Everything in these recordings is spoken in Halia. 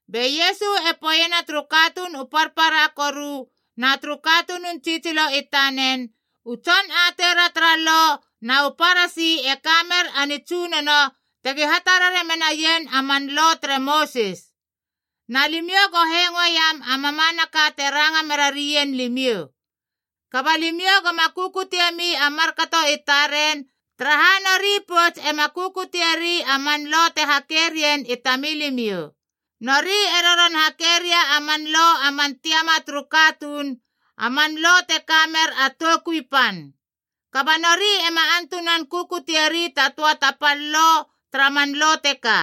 Be Iesu e poeiena turu katuun u parpara koru na turu katunun tsitsilo i tanen, “U tson ateira tara Lo na u Parasi e ka mer a nitsunono tegi hatarare menaien a man Lo tere Mosis. Na limiou go hengoeiam a mamanaka te ranga mera rien limiou. Kaba limiou goma kukutiemi a markato i taren, taraha nori pouts ema kukutieri a man lo te hake rien i tamilimiou. Nori e roron hake ria a man lo a man tiama turu katuun, a man lo te kamer a toukui pan. Kaba nori ema antunan kukutieri ta töa ta pal lo tara man lo teka.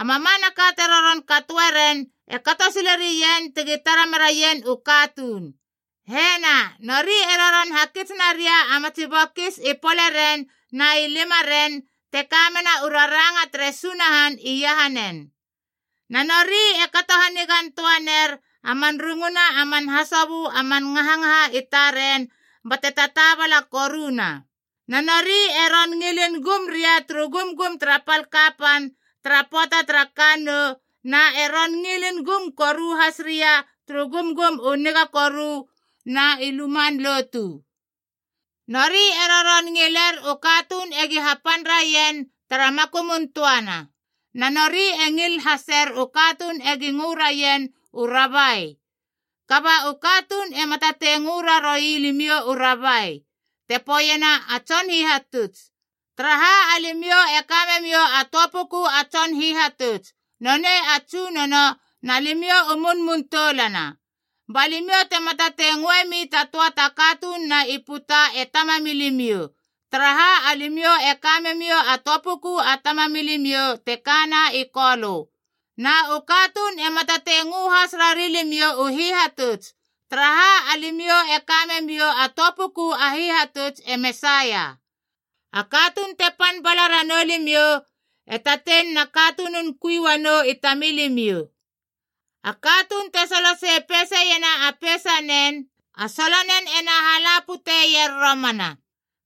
“A mamanaka te roron katoe ren e kato silerien tegi tara meraien u katuun. Hena, nori e roron hakits naria a matsi bokis i poleren na i limaren te kamena u raranga tere Sunahan iahanen. Na nori e kato hanigan töa ner a man runguna a man hasobö a man ngahangaha i taren bate tataabala koruna. Na nori e ron ngilin gum ria turu gumgum tara pal kapan tara pöata tara kannou, na e ron ngilin gum koru has ria turu gumgum u niga koru na i luman lotu. Nori e roron ngiler u katuun egi hapan raien tara makumun töana, na nori e ngil haser u katuun egi ngö raien u Rabai. “Kaba u katuun ema tatei ngö raroui limiou u Rabai (te poeiena a Tson Hihatuts) taraha alimiou e ka memiou a töa puku a Tson Hihatuts, nonei a Tsunono, na limiou u munmun toulana. Ba limiou tema tatei ngöemi ta töa ta katununa i puta e Tamamilimiou, taraha alimiou e ka memiou a töa puku a Tamamilimiou, te kana i Kolö. Na u katuun ema tatei ngö has rari limiou u Hihatutus, taraha alimiou e ka memiou a töa puku a Hihatutus, e Mesaia. A katuun te pan bala ranou limiou e tatein na katunun kui uanou i tamilimiou. A katuun te solo sei peiseiena a peisanen, a solonen ena hala puteier romana.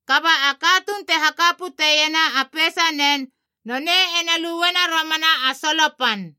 Kaba katuun te haka pute iena a peisanen, nonei ena luena romana a solo pan.”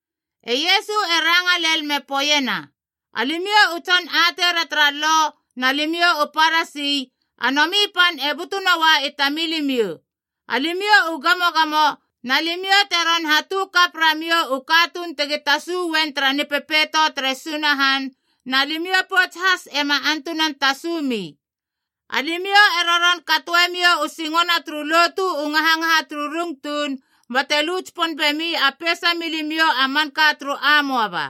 E Iesu e ranga lel me poeiena, “Alimiou u tson ateira tara Lo na limiou u Parasi, a nomi pan e butu noa i tamilimiou! Alimiou u gamogamo, na limiou te ron hatu kap ramiou u katuun tegi tasu uen tara Nipepeito tere Sunahan, na limiou pouts has ema antunan tasumi. Alimiou e roron katoemiou u singona turu lotu u ngahangaha turu rung tuun, bate lu tsipon bemi a peisa milimiou a manka turu amoaba.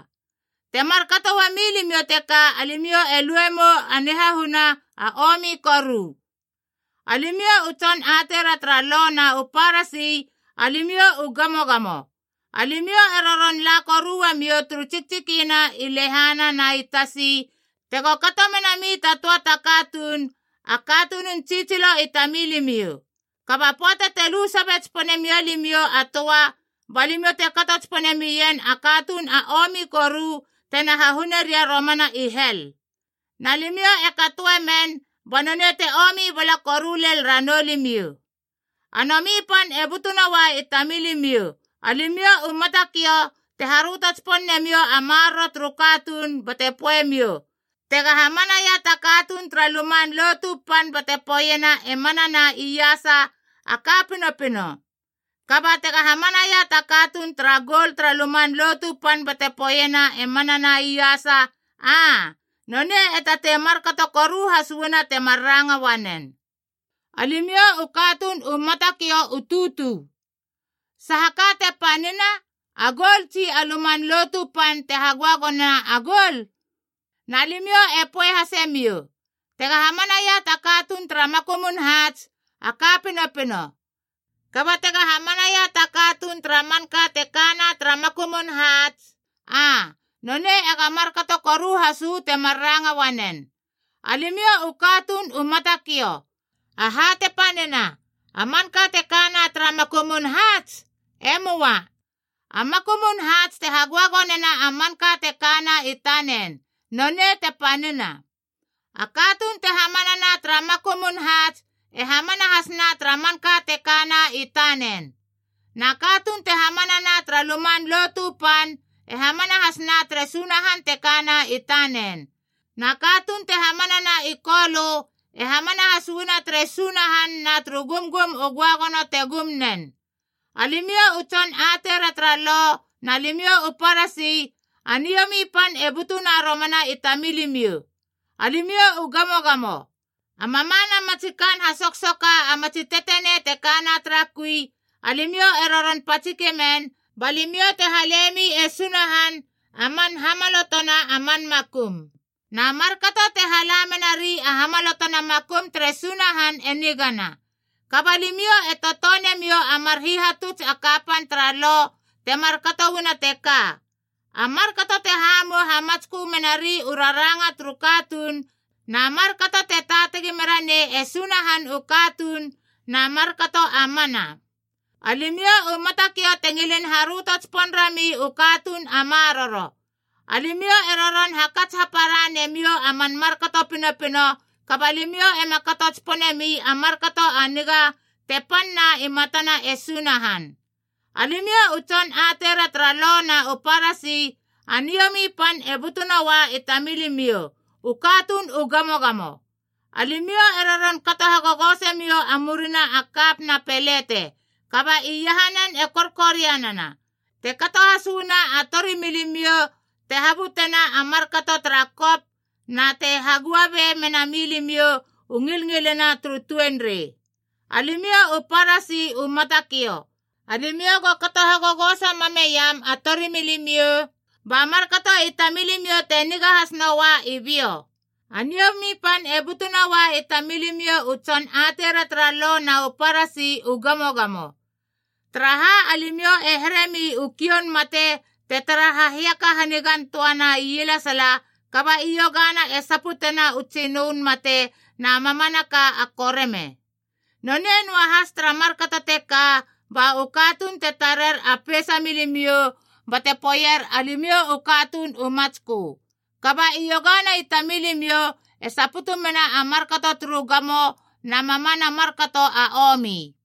Te markato uamilimiou teka alimiou e luemou a nihahuna a omi koru. “Alimiou u tson ateira tara lo na u Parasi, alimiou u gamogamo! Alimiou e roron la koru uamiou turu tsiktsikina i lehana na i tasi, tego kato menami ta töa ta katuun, a katunun tsitsilo i tamilimiou. Kaba pöata te lu sabe tsipone mia limiou a töa, ba limiou te kato tsipone mien a katuun a omi koru tena hahune ria romana i hel. Na limiou e katoe men ba nonei te omi bala koru len ranou limiou. “A nomi pan e butu noa i tamilimiou, alimiou u matakiou te haröto tsipon nemiou a maroro turu katuun bate poeiemiou, ‘Tega hamanaia ta katuun tara Luman Lotu Pan bate poeiena e manana iasa, a ka pinopino. Kaba tega hamanaia ta katuun tara goul tara Luman Lotu Pan bate poeiena e manana iasa, aa, nonei e tatei markato koru has uana temar ranga uanen.’ Alimiou u katuun u matakiou u tutu! Saha ka te panina, a goul, tsi a Luman Lotu Pan te hagöagonena a goul? Na limiou e poe hasemiou, ‘Tega hamanaia ta katuun tara makumun haats, a ka pinopino. Kaba tega hamanaia ta katuun tara manka te kana tara makumun haats, aa, nonei ega markato koru has uu temar ranga uanen.’ Alimiou u katuun u matakiou! Aha te panina, a manka te kana tara makumun haats? E möa. A makumun haats te hagöagonena a manka te kana i tanen, nonei te panina. A katuun te hamanana tara makumun haats e hamana hasna tara manka te kana i tanen. Na katuun te hamanana tara Luman Lotu Pan e hamana hasna tere Sunahan te kana i tanen. Na katuun te hamanana i Kolö e hamana has uana tere Sunahan na turu gumgum u göagono te gum nen. “Alimiou u tson ateira tara Lo na limiou u Parasi, a niomi pan e butuna romana i tamilimiou! Alimiou u gamogamo! A mamana matsi kaan hasoksoka a matsi tetenei te kana tara kui, alimiou e roron patsike men ba limiou te halemi e Sunahan a man hamalotona a man makum. Na markato te hala menari a hamalotona makum tere Sunahan e nigana. Kaba limiou e totone miou a mar hihatuts a kapan tara Lo te markato uana teka: a markato te hamou hamatskö menari u raranga turu katuun, na markato te taatagi mera nei e Sunahan u katuun, na markato a mana. Alimiou u matakiou te ngilin haröto tsipon rami u katuun a maroro. Alimiou e roron hakats hapara nemiou a man markato pinopino, kaba limiou ema kato tsiponemi a markato a niga te panna i matana e Sunahan. “Alimiou u tson ateira tara Lo na u Parasi, a niomi pan e butunoa i tamilimiou, u katuun u gamogamo! Alimiou e roron kato hagogosemiou a murina a kap na pelete, kaba iahanen e korkorianana, te kato has uana a torimilimiou te habutena a markato tara kop na te hagua be menami limiou u ngilngilina turu tuenrei. Alimiou u Parasi u matakiou! Alimiou go kato hagogoso mam meiam a torimilimiou, ba markato i tamilimiou te niga has noa i biou. “A niomi pan e butunoa i tamilimiou u tson ateira tara lo na u Parasi, u gamogamo! Taraha alimiou e heremi u kioun mate te tara ha hiaka hanigan töana ielesala, kaba i iogana e saputena u tsinön mate na mamanaka a koreme. Nonei noahas tara markato teka. Ba u katuun te tarer a peisa milimiou bate poeier alimiou u katuun u matskö. Kaba i iogana i tamilimiou e saputu mena a markato turu gamo na mamana markato a omi.”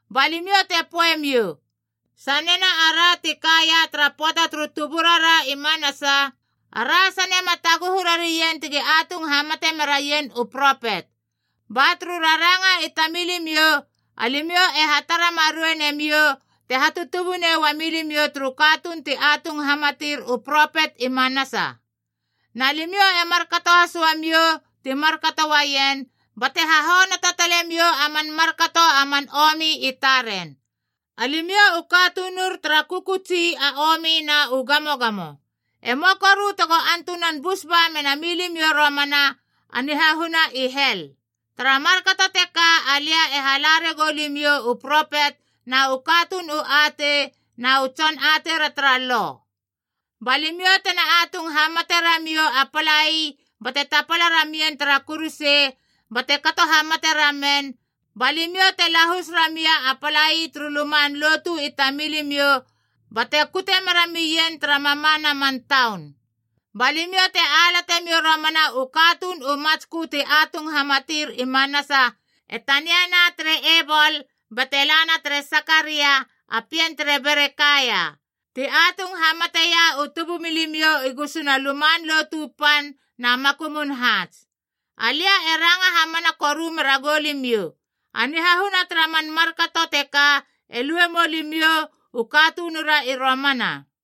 Ba limiou te poeiemiou, ‘Sanena ara ti kaia tara pöata turu tuburara i manasa, ara sane ma taguhu rari ien tegi atung hamate meraien u propet.’ Ba turu raranga i tamilimiou, alimiou e hatara marei nemiou te hatutubunei uami limiou turu katuun ti atung hamatir u propet i manasa! Na limiou e markato has uamiou ti markato uaien, bate hahonoto tale miou a man markato a man omi i taren. “Alimiou u katunur tara kökötsi a omi na u gamogamo! E möa koru tego antunan bus ba mena milimiou romana a nihahuna i hel. Tara markato teka alia e hala ragou limiou u propet na u katuun u atei na u tson ateira tara lo. Ba limiou tena atung hamate ramiou a palai bate tapala ramien tara kuruse bate kato hamate ramen, ba limiou te lahus ramia a palai turu luman lotu i tamilimiou bate kute meramien tara mamana man taun. Ba limiou te alate miou romana u katuun u matskö ti atung hamatir i manasa, e taniaia tere Ebol bate lana tere Sakaria a pien tere Berekaia ti atung hamateia u tubumilimiou i gusuna Luman Lotu Pan na makumun haats. Alia e ranga hamana koru mera goulimiou, a nihahuna tara man markato teka e lue mou limiou u katunura i romana!”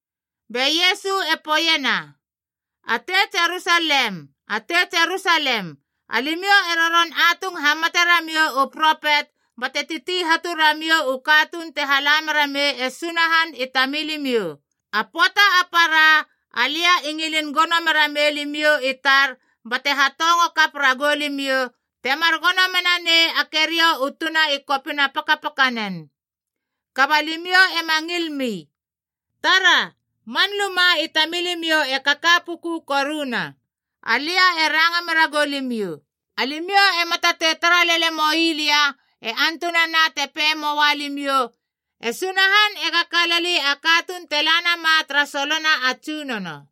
Be Iesu e poeiena, “A tei Jerusalem, atei Jerusalem, alimiou e roron atung hamate ramiou u propet bate titi hatu ramiou u katuun te hala mera mei e Sunahan i tamilimiou! A pöata a para alia i ngilin gono mera mei limiou i tar bate hatongo kap ragou limiou, temar gono mena nei a keriou u tuna i kopina pakapakanen. Kaba limiou ema ngil mi! Tara, man luma i tamilimiou e kaka puku koruna. Alia e ranga mera goulimiou, alimiou ema tatei tara lele moi lia e antunana te pei moa limiou, ‘E Sunahan ega kalali a katuun te la nama tara solona a Tsunono.’”